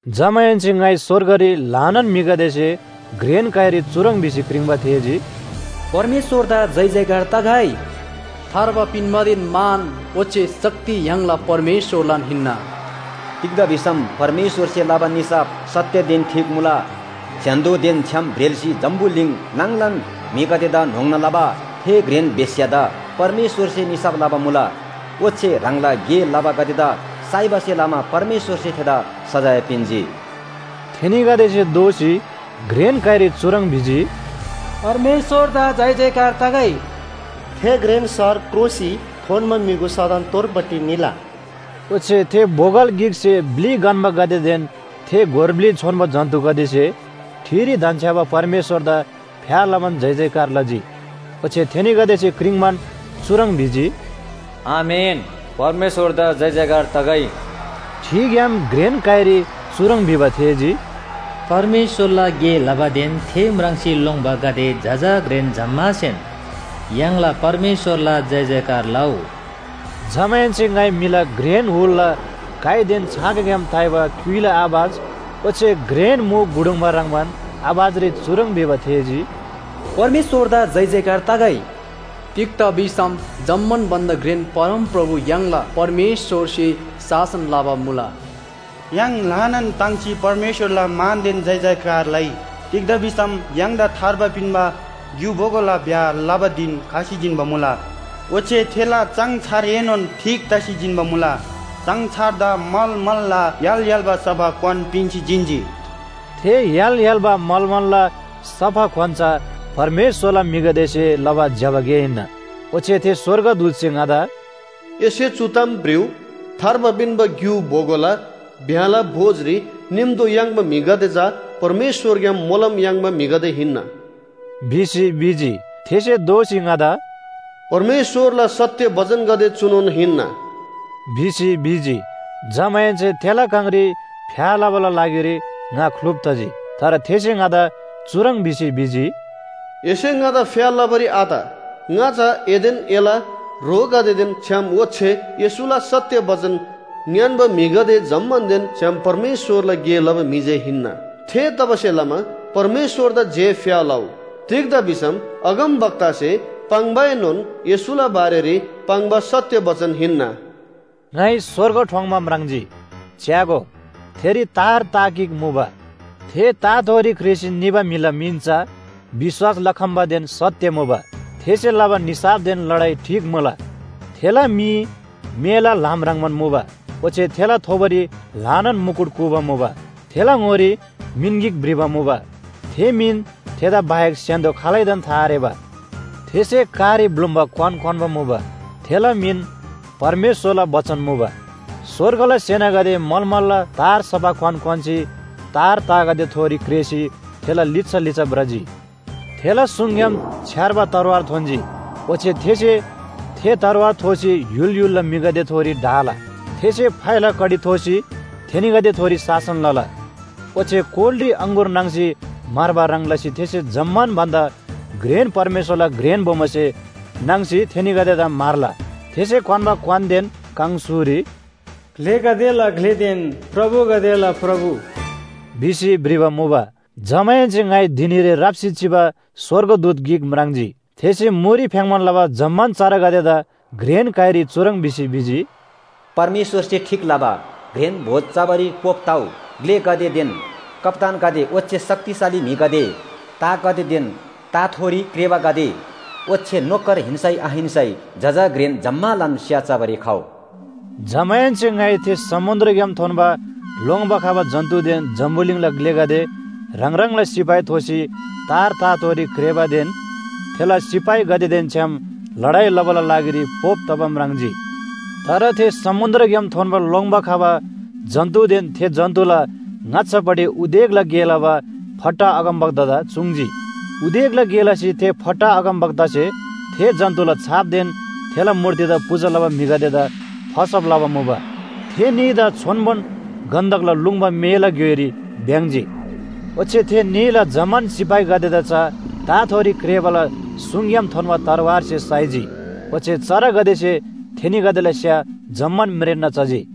जमाहेन्‍से ङाइ स्‍वर्गरी ल्‍हानान म्‍हिगदेसे घ्रेन काइरी चुह्रङ् भिसी क्रिङ्‌बा थेःजी, “परमेश्‍वरदा जयजयकार तगै! थार्बा पिन्‍बादेन मान ओच्‍छे शक्ति य्‍हाङला परमेश्‍वरलान हिन्‍ना। तिग्‍दा भिसम परमेश्‍वरसे लबा निसाफ सत्‍यदेन ठीक मुला। स्‍य्‍हान्‍दोदेन छ्‌याम ब्रेल्‍सी जम्‍बुलिङ नाङलान म्‍हिगदेदा न्‍होङ्ना लबा थे घ्रेन बेश्‍यादा परमेश्‍वरसे निसाफ लबा मुला। ओच्‍छे ह्राङला गे लबागदेदा साइबासे लमा परमेश्‍वरसे थेदा सजाय पिन्‍जी।” थेनीगदेसे दोःसी घ्रेन काइरी चुह्रङ् भिजी, “परमेश्‍वरदा जयजयकार तगै! थे घ्रेन शहर क्रोसी थोन्‍बा म्‍युगु सदन तोरपट्टि निला।” ओच्‍छे थे बोगल गिकसे ब्‍लि गन्‍बागदेदेन थे गोर ब्‍लि छोन्‍बो जन्‍तुगदेसे ठिरी धन्‍छ्‌याबा परमेश्‍वरदा फ्‍या लबान जयजयकार लजी। ओच्‍छे थेनीगदेसे क्रिङ्‌बान चुह्रङ् भिजी। “आमेन!, परमेश्‍वरदा जयजयकार तगै!” ठिग्‍याम घ्रेन काइरी चुह्रङ् भिबा थेःजी, “परमेश्‍वरला गे लबादेन थे म्राङ्सी लोङ्‌बागदे जजा घ्रेन जम्‍मासेन य्‍हाङला परमेश्‍वरला जयजयकार लउ।” जमाहेन्‍से ङाइ म्‍हिला घ्रेन हुलला काइदेन छाँगाग्‍याम ताइबा क्‍युइला आवाज ओच्‍छे घ्रेन मु गुडुङ्बा ह्रङ्‌बान आवाजरी चुह्रङ् भिबा थेःजी, “परमेश्‍वरदा जयजयकार तगै! तिग्‍दा भिसम जम्‍मान भन्‍दा घ्रेन परमप्रभु य्‍हाङला परमेश्‍वरसे शासन लबा मुला। य्‍हाङ ल्‍हानान ताङ्सी परमेश्‍वरला मानदेन जयजयकार लइ! तिग्‍दा भिसम य्‍हाङदा थार्बा पिन्‍बा ग्‍यु बोगोला ब्‍याह लबा धिन खसी जिन्‍बा मुला। ओच्‍छे थेला चाङछारएनोन ठीक तसी जिन्‍बा मुला। चाङछारदा मलमलला य्‍हाल य्‍हाल्‍बा सफा क्‍वान पिन्‍सी जिन्‍जी।” थे य्‍हाल य्‍हाल्‍बा मलमलला सफा क्‍वान चा परमेश्‍वरला म्‍हिगदेसे लबा ज्‍यबा गे हिन्‍ना। ओच्‍छे थे स्‍वर्गदूतसे ङादा “एसे चु ताम भ्रिउ, थार्बा पिन्‍बा ग्‍यु बोगोला ब्‍याहला भोजरी निम्‍तो याङ्बा म्‍हिगदे चा परमेश्‍वरग्‍याम मोलम याङ्बा म्‍हिगदे हिन्‍ना” भिसी भिजी। थेसे दोःसी ङादा “परमेश्‍वरला सत्‍य बचनगदे चुनोन हिन्‍ना” भिसी भिजी। जमाहेन्‍से थेला काङरी फ्‍या लबाला लागिरी ङा ख्‍लुप तजी। तर थेसे ङादा चुह्रङ् भिसी भिजी, “एसे ङादा फ्‍या लबारी आत। ङा चा एदेन एला ह्रोगदेदेन छ्‌याम ओच्‍छे येशूला सत्‍य बचन ङ्‌यान्‍बा म्‍हिगदे जम्‍मानदेन छ्‌याम परमेश्‍वरला गे लबा म्‍हि जे हिन्‍ना। थेतबासेलमा परमेश्‍वरदा जे फ्‍या लउ। तिग्‍दा भिसम अगमवक्तासे पाङ्‌बाएनोन येशूला बारेरी पाङ्बा सत्‍य बचन हिन्‍ना। ङाइ स्‍वर्ग ठोङ्‌बा म्राङ्जी, च्‍यागो, थेरी तार ता गिक मुबा। थे ताथोरी क्रेःसी निबा म्‍हिला मिन चा विश्‍वास लखम्‍बादेन सत्‍य मुबा। थेसे लबा निसाफदेन लडाइ ठीक मुला। थेला मी मेला ल्‍हाम ह्रङ्‌बान मुबा, ओच्‍छे थेला थोबोरी ल्‍हानान मुकुट कूबा मुबा। थेला ङोरी मिन गिक भ्रिबा मुबा, थे मिन थेदा बाहेक स्‍य्‍हान्‍दो खालैदान था आरेबा। थेसे कारी ब्‍लुम्‍बा क्‍वान क्‍वान्‍बा मुबा। थेला मिन “परमेश्‍वरला बचन” मुबा। स्‍वर्गला सेनागदे मलमलला तार सफा क्‍वान क्‍वान्‍सी तार तागदेथोरी क्रेःसी थेला लिच्‍छा लिच्‍छा भ्रजी। थेला सुङग्‍याम छ्‌यार्बा तरवार थोन्‍जी, ओच्‍छे थेसे थे तरवार थोसी य्‍हुल य्‍हुलला म्‍हिगदेथोरी ढाला। थेसे फाइला कडी थोसी थेनीगदेथोरी शासन लला। ओच्‍छे कोलरी अङगुर नाङ्सी म्‍हर्बा ह्रङ् लसी थेसे जम्‍मान भन्‍दा घ्रेन परमेश्‍वरला घ्रेन बोमोसे नाङ्सी थेनीगदेदा म्‍हर्ला। थेसे क्‍वान्‍बा क्‍वानदेन काङस्‍हुरी “ग्‍लेगदेला ग्‍लेदेन प्रभुगदेला प्रभु” भिसी भ्रिबा मुबा। जमाहेन्‍से ङाइ धिनीरी राप्‍सी चिबा स्‍वर्गदूत गिक म्राङ्जी। थेसे मुरी फ्‍याङ्‌बान लबा जम्‍मान चरागदेदा घ्रेन काइरी चुह्रङ् भिसी भिजी, “परमेश्‍वरसे ठीक लबा घ्रेन भोज चबारी पोप तउ। ग्‍लेगदेदेन कप्‍तानगदे ओच्‍छे शक्तिशाली म्‍हिगदे, तागदेदेन ताथोरी क्रेःबागदे, ओच्‍छे नोकर हिन्‍सै आहिन्‍सै, जजा, घ्रेन जम्‍मालान स्‍या चबारी खउ।” जमाहेन्‍से ङाइ थे समुन्‍द्रग्‍याम थोन्‍बा लोङ्‌बा खबा जन्‍तुदेन जम्‍बुलिङला ग्‍लेगदे ह्राङ ह्राङला सिपाही थोसी तार ताथोरी क्रेःबादेन थेला सिपाहीगदेदेन छ्‌याम लडाइ लबाला लागिरी पोप तबा म्राङ्जी। तर थे समुन्‍द्रग्‍याम थोन्‍बा लोङ्‌बा खबा जन्‍तुदेन थे जन्‍तुला ङाच्‍छापट्टि उदेकला गे लबा फट्टा अगमवक्तादा चुङ्‌जी। उदेकला गे लसी थे फट्टा अगमवक्तासे थे जन्‍तुला छापदेन थेला मूर्तिदा पूजा लबा म्‍हिगदेदा फसब लबा मुबा। थे न्‍हीदा छोन्‍बोन गन्‍धकला लुङ्बा मेला ग्‍योइरी भ्‍याङ्‍जी। ओच्‍छे थे न्‍हीला जम्‍मान सिपाहीगदेदा चा ताथोरी क्रेःबाला सुङग्‍याम थोन्‍बा तरवारसे साइजी। ओच्‍छे चरागदेसे थेनीगदेला स्‍या जम्‍मान म्रेन्‍ना चजी।